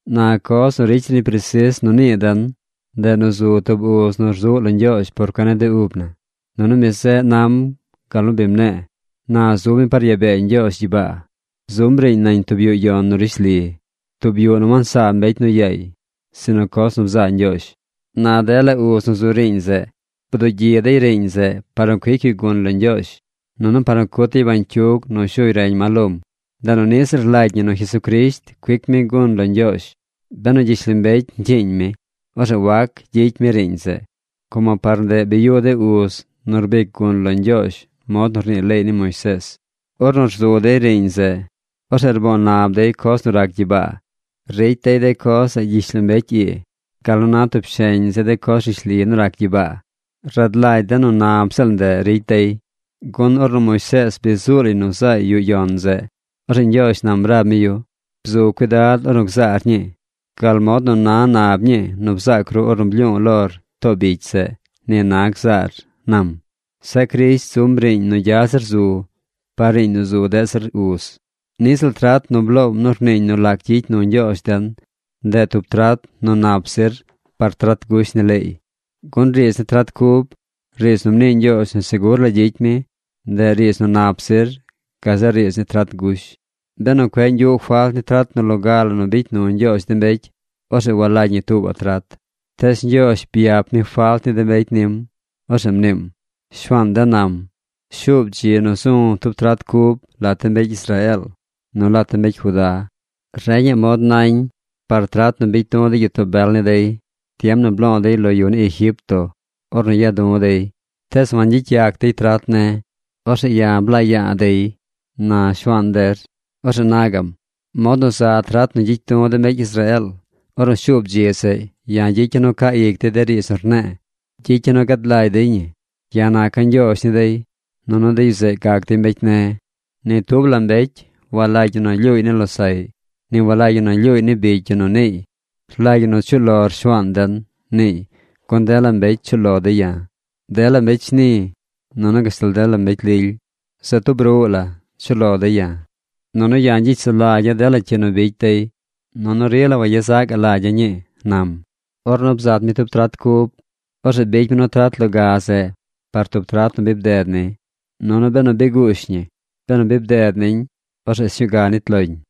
Na coz nu ricy zir ñi presis nu nii den, ndeꞌ nu zu tub uz nu rzuꞌ lo Ñgyoozh por cuen ni de ub na. Nunu mi zeꞌ nam gal nu bi mne̱e̱. Na zub mi par yaa bee Ñgyoozh gyibaa. Zum riiñ nañ tub yuꞌ yon nu rishli, tub yuꞌ nu wansaa mbecy nu yaay, sinu coz nu bzaa Ñgyoozh. Na dela uz nu zu riiñ zeꞌ bdugyi dey riiñ zeꞌ par nu cuic yu gun lo Ñgyoozh, nunu par nu cut dey bañcyug nu shuy reñ ma lom. Ndeꞌ nu niꞌ ziꞌl rlagy ñi nu Jesucrisht cuic mi gun lo Ñgyoozh. Benu gyishlombecy ñcyiiñ mi, orzeꞌ wac gyicy mi riiñ zeꞌ, como par ndeꞌ bi yuꞌ de uz nu rbic gun lo Ñgyoozh mod nu rnii leey ni Moisees. Ornu rzu dey riiñ zeꞌ, orzeꞌ rboo nab dey coz nu rac gyibaa. Ricy dey de coz zeꞌ gyishlombecy ii gal nu na tub sheñ zi de coz rishli nu rac gyibaa. Rad lagy den nu nab ziꞌl ndeꞌ ricy dey, gun ornu Moisees bi zuu lay nu zaay yuꞌ yon zeꞌ, orzeꞌ Ñgyoozh nam rab mi yu: “Bzu cuidad ornu gzaar ñii. Gal mod nu na nab ñii nu bzaac ru ornu blyu̱u̱ lor too bicy zeꞌ, ni na gzaar”, nam. Zeꞌ Crisht zum tub riiñ nu gya zir zu par riiñ nu zu deꞌ zir uz. Niꞌ ziꞌl trat nu bloom nu rniiñ nu lac gyicy nu Ñgyoozh den, ndeꞌ tub trat nu nap zir par trat gush ni leey, gun riidz ni trat cub, riidz nu mnii Ñgyoozh nu segur la gyicy mi, ndeꞌ riidz nu nap zir gazeꞌ riidz ni trat gush. Benu cueꞌ ñgyuꞌ falt ni trat nu loga la nu bicy nu Ñgyoozh de mbecy, orzeꞌ walagy ñi tuubaꞌ trat. Tees Ñgyoozh byap mi falt ni de mbecy nim. Orzeꞌ mniim: Shuaan den nam: Shuub dzi nu zu̱ tub trat cub lat de mbecy Israeel nu lat de mbecy Judá. Reñaꞌ mod nañ par trat nu bicy du̱ de gyitoo bel ni dey tiem nu blo̱o̱ dey lo yu ni Egipto ornu ya̱a̱ du̱ dey. Tees wangyicy yac dey trat ne̱. Orzeꞌ ya̱ blaa ya̱a̱ dey, na Shuaan der. Orzeꞌ na gaꞌm: Mod nu za trat nu gyicy du̱ de mbecy Israeel: Ornu shuub dzi zeꞌ, ya̱ gyicya̱ nu caa ic dey de riidz nu rne̱e̱. Gyicya̱ nu gad lagy dey ñi. Ya̱ naca̱ Ñgyoozh ni dey, nunu de yu zeꞌ gac dey mbecy ne̱. Ni tub la mbecy walagy ñi nu lyuuy ni losaꞌy. Ni walagy ñi nu lyuuy ni bicy yu nu niiy: “Rlagy ñi nu chuꞌ lor Shuaan den”, niiy, gun dela mbecy chuꞌ lo dey ya̱. Dela mbecy shni, nunu gashtal dela mbecy lily, se tub ruꞌ la chuꞌ lo dey ya̱. Nunu ya̱ gyicy sulagya̱ dela cyi nu bicy dey. Nunu rila wayezaꞌ gaꞌ lagya̱ ñii, nam. Ornu bzat mi tub trat cub, orzeꞌ bicy mi nu trat loga zeꞌ par tub trat nu bi bded ni. Nunu benu bi guush ñi, benu bi bded niñ, orzeꞌ sñuu ga nit loñ.